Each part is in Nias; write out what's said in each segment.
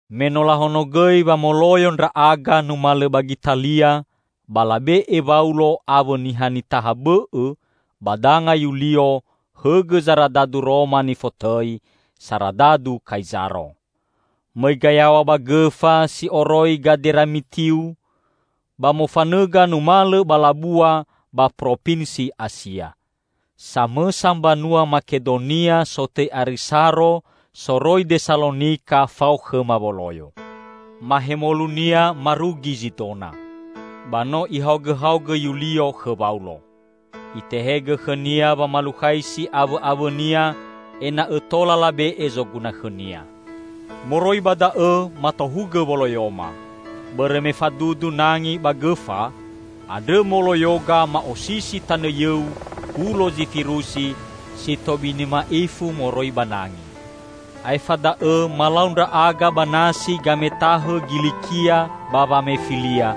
Me no lahonogõi wa moloyo ndra'aga numalõ ba Gitalia, ba labe'e Waulo awõ niha nitaha bõ'õ ba danga Yulio hõgõ zaradadu Roma nifotõi "Saradadu Kaizaro." Mõiga yaw̃a ba gõfa si oroi Gaderamitiu, ba mofanõga numalõ ba labua ba propinsi Asia. Samõsa mbanua Makedonia sotõi Arisaro soroi Desalonika fao khõma woloyo. Mahemolunia marugi Zidona. Ba no ihaogõhaogõ Yulio khõ Waulo. Itehegõ khõnia wamalukhaisi awõ'awõnia ena'õ tola labe'e zoguna khõnia. Moroi ba da'õ matohugõ woloyoma. Bõrõ me fadudu nangi ba gõfa, andrõ moloyoga ma'osisi tanõ yõu hulo Zifirusi si tobini ma'ifu moroi ba nangi. Aefa da'õ malau ndra'aga ba nasi gametahõ Gilikia ba Wamefilia,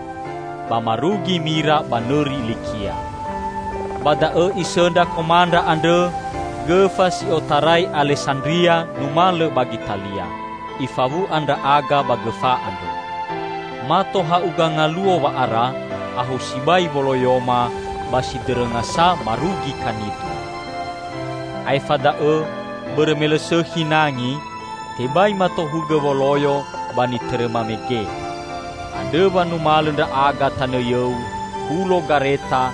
ba marugi Mira ba nõri Likia. Ba da'õ isõndra komandra andrõ gõfa si otarai Alesandria numalõ ba Gitalia. Ifawu'a ndra'aga ba gõfa andrõ. Mato ha'uga ngaluo wa'ara ahou sibai woloyoma, ba sidõrõngasa marugi Kanidu. Aefa da'õ bõrõ me lõ sõkhi nangi, tebai matohugõ woloyo ba nitõrõma mege. Andrõ wa numalõ ndra'aga tanõ yõu hulo Gareta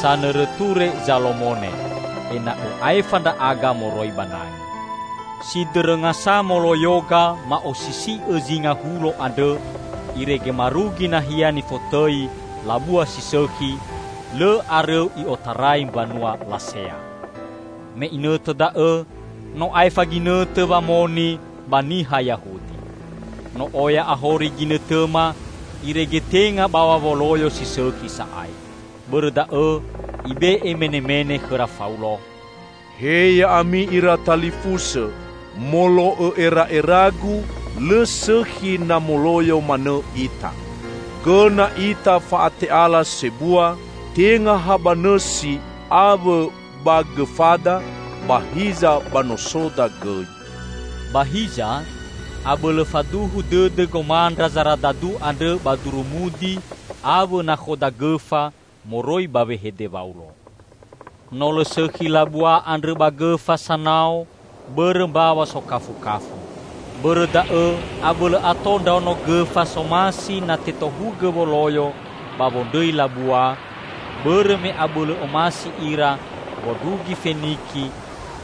sanõrõ Ture Zalomone, ena'õ aefa ndra'aga moroi ba nangi. Sidõrõngasa moloyoga ma'osisi'õ zinga hulo andrõ irege marugi nahia nifotõi Labua si Sõkhi, lõ arõu i'otarai mbanua Lasea. Me inõtõ da'õ no aefa ginõtõ wamoni ba niha Yahudi. No oya ahori ginõtõma, irege tenga baw̃a woloyo si sõkhi sa'ae. Bõrõ da'õ ibe'e menemene khõra Faulo, "He ya'ami ira talifusõ, molo'õ era'eragu lõ sõkhi na moloyo manõ ita. Gõna ita fa'ate'ala sebua, tenga ha ba nõsi awõ ba gõfada, ba hiza ba nosoda gõi." Ba hiza, abõlõ faduhu dõdõ gomandra zaradadu andrõ ba durumudi awõ nakhoda gõfa moroi ba wehede Waulo. No lõ sõkhi labua andrõ ba gõfa sanao bõrõ mbaw̃a sokafukafu. Bõrõ da'õ abõlõ ato ndraono gõfa somasi na tetohugõ woloyo ba wondrõi labua, bõrõ me abõlõ omasi ira wondrugi Feniki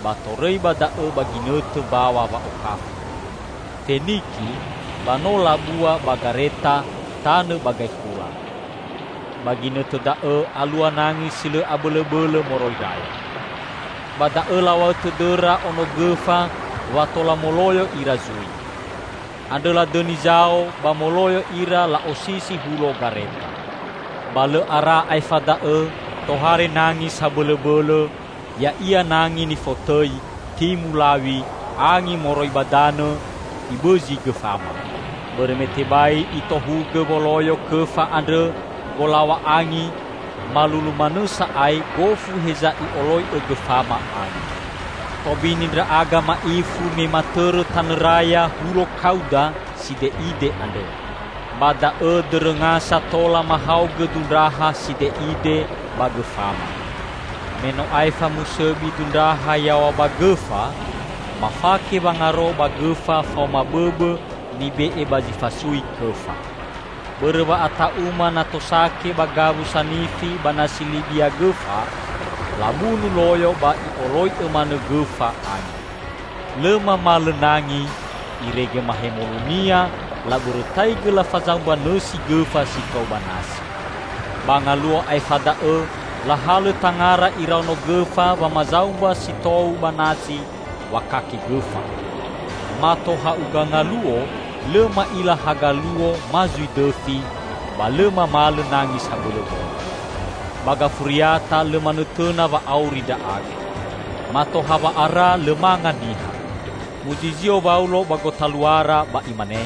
ba torõi ba da'õ ba ginõtõ mbaw̃a wa'okafu. Feniki ba no labua ba Gareta tanõ ba gaekhula. Ba ginõtõ da'õ alua nangi si lõ abõlõbõlõ moroi raya. Ba da'õ law̃a'õ tõdõra ono gõfa wa tola moloyo ira zui. Andrõ ladõni zao ba moloyo ira la'osisi hulo Gareta. Ba lõ ara aefa da'õ tohare nangi sabõlõbõlõ -- ya'ia nangi nifotõi Timu law̃i -- angi moroi ba danõ, ibõzi gõfama. Bõrõ me tebai itohugõ woloyo kõfa andrõ wolaw̃a angi, malulu manõ sa'ae gofu heza i'oloi'õ gõfama angi. Tobini ndra'aga ma'ifu me matõrõ tanõ raya hulo Kauda side'ide andrõ. Ba da'õ dõrõngasa tola mahaogõ dundraha side'ide ba gõfama. Me no aefa musõbi dundraha yaw̃a ba gõfa, mafake wangaro ba gõfa faoma bõbõ nibe'e ba zi fasui kõfa. Bõrõ wa'ata'uma na tosake ba gawu sanifi ba nasi Libia gõfa, labunu loyo ba i'oloi'õ manõ gõfa angi. Lõ mamalõ nangi, irege mahemolunia labõrõtaigõ lafazaumba nõsi gõfa si tou ba nasi. Ba ngaluo aefa da'õ lahalõ tangara iraono gõfa wamazaumba si tou ba nasi wakake gõfa. Mato ha'uga ngaluo lõ ma'ila haga luo ma zui dõfi, ba lõ mamalõ nangi sabõlõbõlõ. Ba gafuriata lõ manõtõna wa auri ndra'aga. Mato hawa'ara lõ manga niha. Muzizio Waulo ba gotaluara ba imane,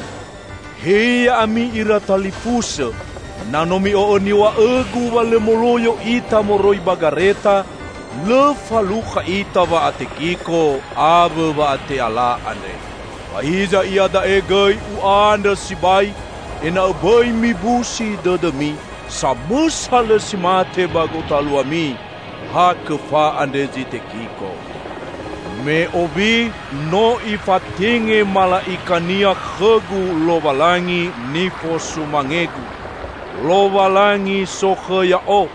"He ya'ami ira talifusõ! Na no mi'o'õ niw̃a'õgu wa lõ moloyo ita moroi ba Gareta, lõ falukha ita wa'atekiko awõ wa'ate'ala andre. Ba hiza iada'e gõi u'andrõ sibai ena'õ bõi mibusi dõdõmi. Samõsa lõ si mate ba gotaluami; ha kõfa andre zi tekiko. Me owi no ifatenge mala'ika-Nia khõgu Lowalangi nifosumangegu, Lowalangi sokhõ ya'o.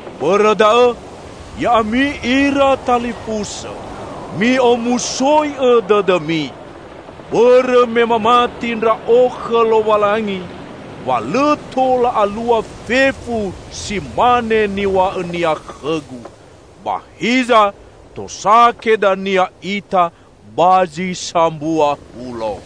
Bõrõ da'õ, ya'ami ira talifusõ, mi'omusoi'õ dõdõmi! Bõrõ me mamati ndra'o khõ Lowalangi wa lõ tola alua fefu si mane niw̃a'õ-Nia khõgu. Ba hiza tosake dania ita ba zi sambua hulo."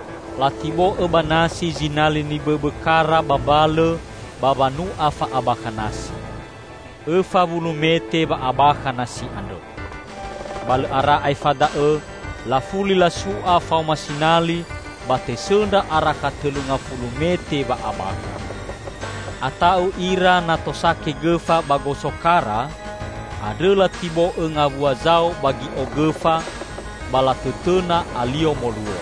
Latibo'õ ba nasi zinali nibõbõ kara ba mbalõ ba wanu'a fa'abakha nasi. Õfa wulu mete wa'abakha nasi andrõ. Ba lõ ara aefa da'õ lafuli lasu'a faoma sinali ba tesõndra arakha tõlu ngafulu mete wa'abakha. Ata'u ira na tosake gõfa ba goso kara, andrõ latibo'õ ngawua zao ba gi'o gõfa, ba latõtõna alio moluo.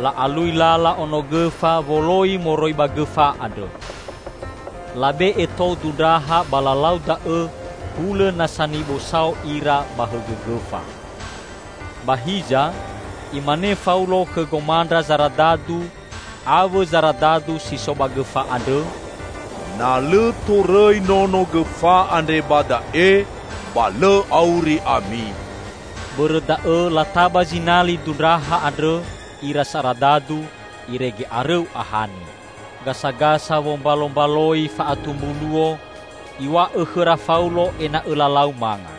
La'alui lala ono gõfa woloi moroi ba gõfa andrõ. Labe'e tou dundraha ba lalau da'õ hulõ na sanibo sao ira ba hõgõ gõfa. Ba hiza imane Faulo khõ gomandra zaradadu awõ zaradadu si so ba gõfa andrõ, "Na lõ torõi nono gõfa andre ba da'e, ba lõ auri ami." Bõrõ da'õ lataba zinali dundraha andrõ ira saradadu, irege arõu ahani. Gasagasa wombalombaloi fa'atumbu luo, iw̃a'õ khõra Faulo ena'õ lalau manga.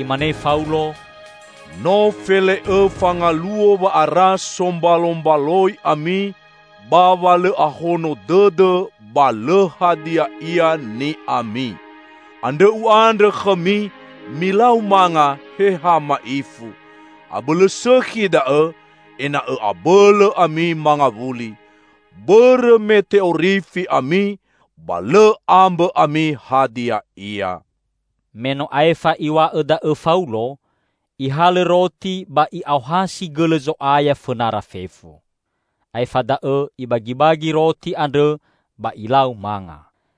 Imane Faulo, "No fele'õfa ngaluo wa'ara sombalombaloi ami ba wa lõ ahono dõdõ ba lõ hadia ia ni'ami. Andrõ u'andrõ khõmi, milau manga he ha ma'ifu. Abõlõ sõkhi da'õ, ena'õ abõlõ ami mangawuli. Bõrõ me te'orifi ami ba lõ ambõ ami hadia ia." Me no aefa iw̃a'õ da'õ Faulo ihalõ roti ba i'aohasi gõlõ Zo'aya fõnara fefu. Aefa da'õ ibagibagi roti andrõ, ba ilau manga.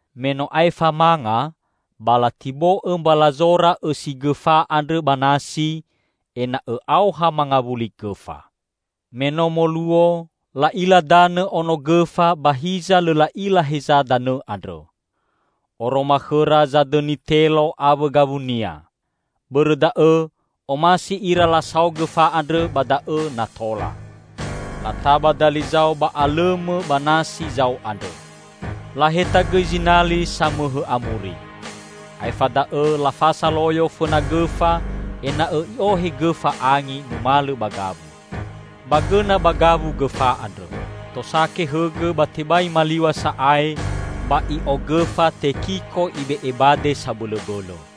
Me no aefa manga, ba latibo'õ mbalazora õsi gõfa andrõ ba nasi ena'õ aoha mangawuli gõfa. Me no moluo, la'ila danõ ono gõfa ba hiza lõ la'ila heza danõ andrõ. Oroma khõra zadõni telo awõ gawunia. Bõrõ da'õ omasi ira lasao gõfa andrõ ba da'õ na tola. Lataba dali zao ba alõmõ ba nasi zao andrõ. Laheta gõi zinali samõhõ amuri. Aefa da'õ lafasa loyo fõna gõfa ena'õ i'ohe gõfa angi numalõ ba gawu. Ba gõna ba gawu gõfa andrõ. Tosake hõgõ ba tebai maliw̃a sa'ae, ba i'o gõfa tekiko ibe'e bade sabõlõbõlõ.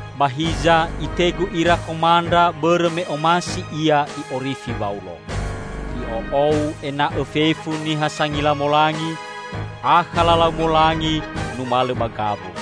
Ba hiza itegu ira komandra bõrõ me omasi ia i'orifi Waulo. I'o'ou ena'õ fefu niha sangila molangi akha lalau molangi numalõ ba gawu;